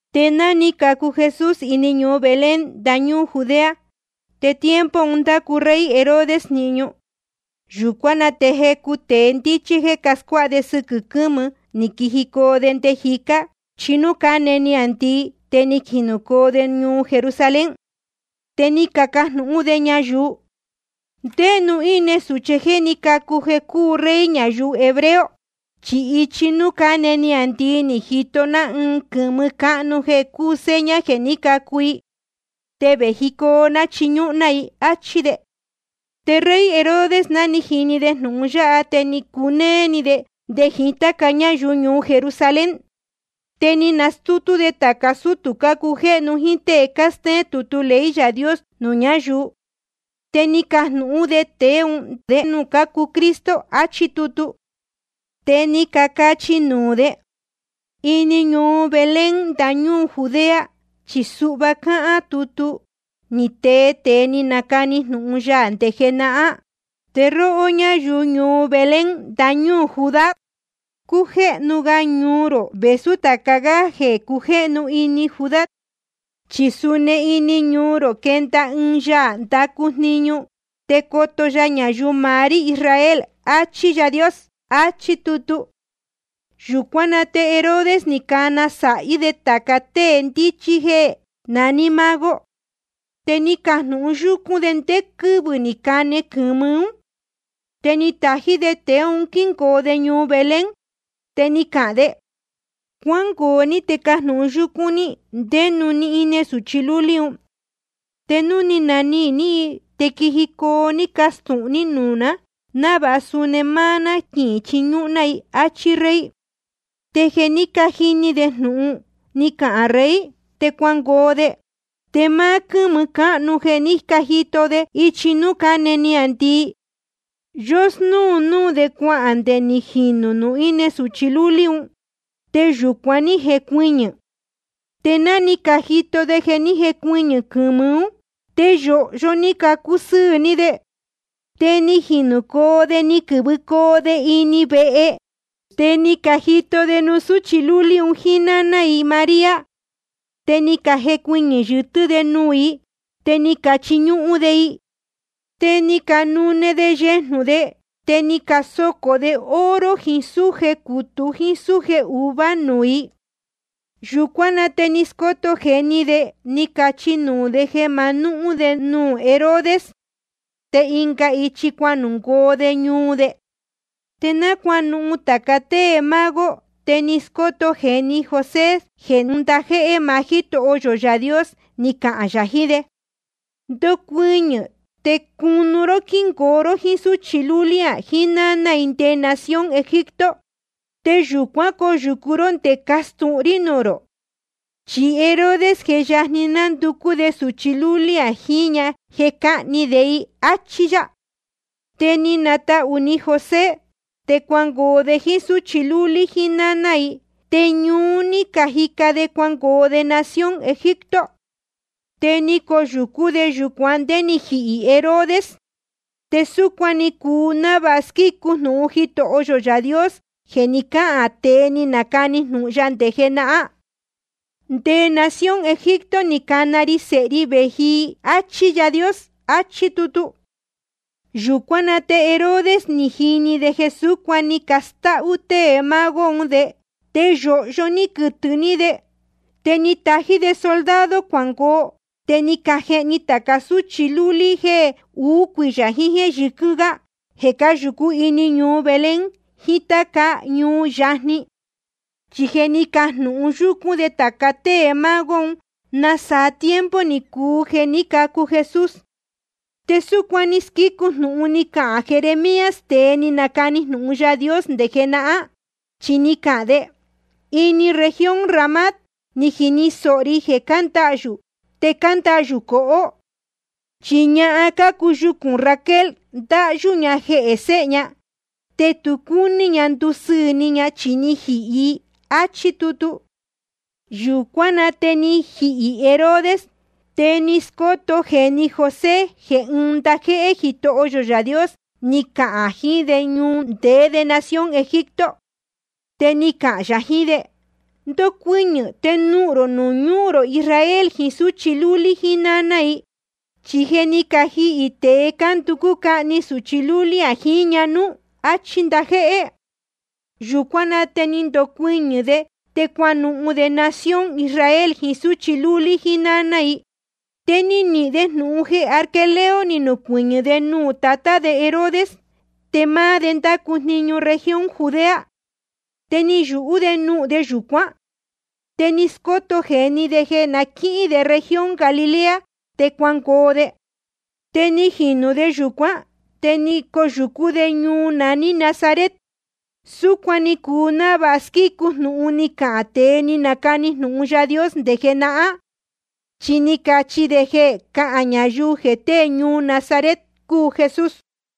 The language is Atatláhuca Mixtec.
Te ná ni cacu Jesús ini ñuu Belén ndañúū Judea, te tiempo un ndácu rey Herodes jniñu. Yūcuán na te jecu tēe ndíchí jéē cascuáha sɨquɨ̄ quɨ́mɨ, ni quijicoo de nde jicá, ichi nuū cáne niāndii, te ni jinūcoo de ñuu Jerusalén. Te ni cacajnūhún de ñayuu: ¿Ndé nuū íne sūchí jeē ní cacu jeē coo rey ñayuu hebreo? Chi ichi núū cáne niāndii ni cajito ná ɨɨn quɨ̄mɨ cáhnu jeē cúu seña jeē ní cacu i. Te vējicoo ná chiñúhún ná i, áchí de. Te rey Herodes, ná ni jini de jnūhun yáha, te ni cunéé ni de, nde jiín táca ñáyuu ñuu Jerusalén. Te ni nastútú de tāca sútū cácujéhnu jíín tée cástéén tutu ley Yaā Dios nuū ñáyuu. Te ni cajnūhún de tēe un ndé nuū cacu Cristo achí tutu. Te ni cacachi nuū de: Ini ñuu Belén ndañúū Judea. Chi suhva cáhán nuū tútu ni tee tēe ni nacani jnūhun ya nde jenahán: Te róhó ñáyuu ñuu Belén ndañúū Judá, cújéhnu ga ñuu rō vēsú tāca gá jeē cujéhnu ini Judá. Chi suu ini ñuu rō quenda ɨɨn Yaā ndacu jniñu, te coto ya ñayuu maá rí Israel, achí Yaā Dios. Achí tutu. Yūcuán na te Herodes ni cana sāhí de tāca tée ndíchí un jéē naní mago. Te ni cajnūhun yúcún de ndé quɨ́vɨ̄ ní cane quɨ̄mɨ ún. Te ni tají de tēe un quíngoo de ñuu Belén. Te ni cahān de: Cuángoo ní te cajnūhun yúcún ní ndé nuū íne sūchi lúlí un. Te núu ni nanihīn ní i, te quijicoo ní castūhun ní nuū ná, návāha suni máá ná quichiñúhún ná i, áchí rey. Te jeē ní cajini de jnūhun ni cahān rey, te cuangoo de. Te máá quɨ́mɨ cáhnu jeē ní cajito de ichi núū cáne niāndii, yósnúu núū de cuahān nde ni jinū nuū íne sūchi lúlí un, te yūcuan ní jecuɨñɨ̄. Te ná ni cajito de jeē ní jecuɨñɨ̄ quɨ̄mɨ ún, te yōhyo ni cacusɨɨ̄ ni de. Te ni jinūcoo de ni quɨ̄vɨcoo de ini vehe, te ni cajito de nuū súchi lúlí un jíín náná i María. Te ni cajecuɨñɨ̄ yɨtɨ́ de nuū i, te ni cachiñúhún de i. Te ni canune de yejnū de, te ni casocō de oro jiín súje cūtú jíín súje uvuā nuū i. Yūcuán na te ni scóto jēni de, ni cachi nuū de jeē ma nuhún de nuū Herodes. Te ɨnga ichi cuanuhun de ñuu de. Te náa cuánuhun tāca tée mago, te ni scóto jēni José jeē ɨɨn ndajéhé maá Jítoho yō Yaā Dios ni cahān yā jiín de: Ndocuɨñɨ̄ te cunu ró quíngoo ró jíín súchi lúlí jíín náná i nde nación Egipto. Te yūcuán coyūcu ró nde castūhun rí nuū rō. Chi Herodes je yajni nanducú de sūchi lúlí jíñā jeē cáhni de i. Achí yá. Te ni natahū ni José. Te cuangoo de jíín súchi lúlí jíín náná i, te ñuú ní cajica de cuangoo de nación Egipto. Te ni coyūcú de yūcuan ndé ni jihī Herodes. Te súcuan ni cuu návāha squícu jnūhun Jitoho yō Yaā Dios jeē ni cáhān tēe ni nacani jnūhun ya nde jenahán: Nde nación Egipto ni cana ri Sēhe ri vēji i, áchí Yaā Dios, achí tutu. Yūcuán na te Herodes ni jini de jeē súcuan ni castáhú tée mago un de, te yōhyo ni quɨtɨ̄ ni de. Te ni tají de soldado cuangoo, te ni cajehni tāca súchi yɨ́ɨ́ lúlí jéē uú cuiyā jiín jéē yɨquɨ́n gá jeē cáyūcú ini ñuu Belén jiín táca ñuu yajni. Chi je ni cajnūhun yúcún de tāca tée mago un nasaa tiempo ni cuu jeē ní cacu Jesús. Te súcuan ni squícu jnūhun ni cahān Jeremías, tēe ni nacani jnūhun Yaā Dios nde jenahán, chi ni cahān de: Ini región Ramá ni jini sōho ri jeē cándahyū te cándahyū cohó. Chi ñahan cácuu yucūn Raquel, cándahyū ña jehē séhe ña, te tu cácuni ña ndusɨɨ̄ ni ña, chi ni cajihī i. Achí tutu. Yūcuán na te ni jihī Herodes. Te ni scóto jēni José jeē ɨɨn ndajéhé Jitoho yō Yaā Dios ni cahān yā jiín de nuū ndeé de nación Egipto. Te ni cahān yā jiín de: Ndocuɨñɨ̄ te nuhun rō ñuu rō Israel jiín súchi lúlí jíín náná i. Chi je ni cajihī tēe cánducú cahni sūchi lúlí jíñā nuú. Achí ndajéhé. Yūcuán na te ni ndocuɨñɨ̄ de, te cuanuhun de nación Israel jiín súchi lúlí jíín náná i. Te ni nihīn de jnūhun jeē Arquelao ni nucuɨñɨ̄ de nuū tatá de Herodes, te máá de ndácu jniñu región Judea. Te ni yūhú de nuhun de yūcuán. Te ni scóto jēni de jeē na quíhín de región Galilea, te cuangoo de. Te ni jinū de yūcuán, te ni coyūcú de ñuu naní Nazaret. Súcuan ni cuu návāha squícu jnūhun ni cacahān tēe ni canacani jnūhun Yaā Dios nde jenahán. Chi ni cacachi de jeē cahān ñayuu jeē tée ñuu Nazaret cúu Jesús.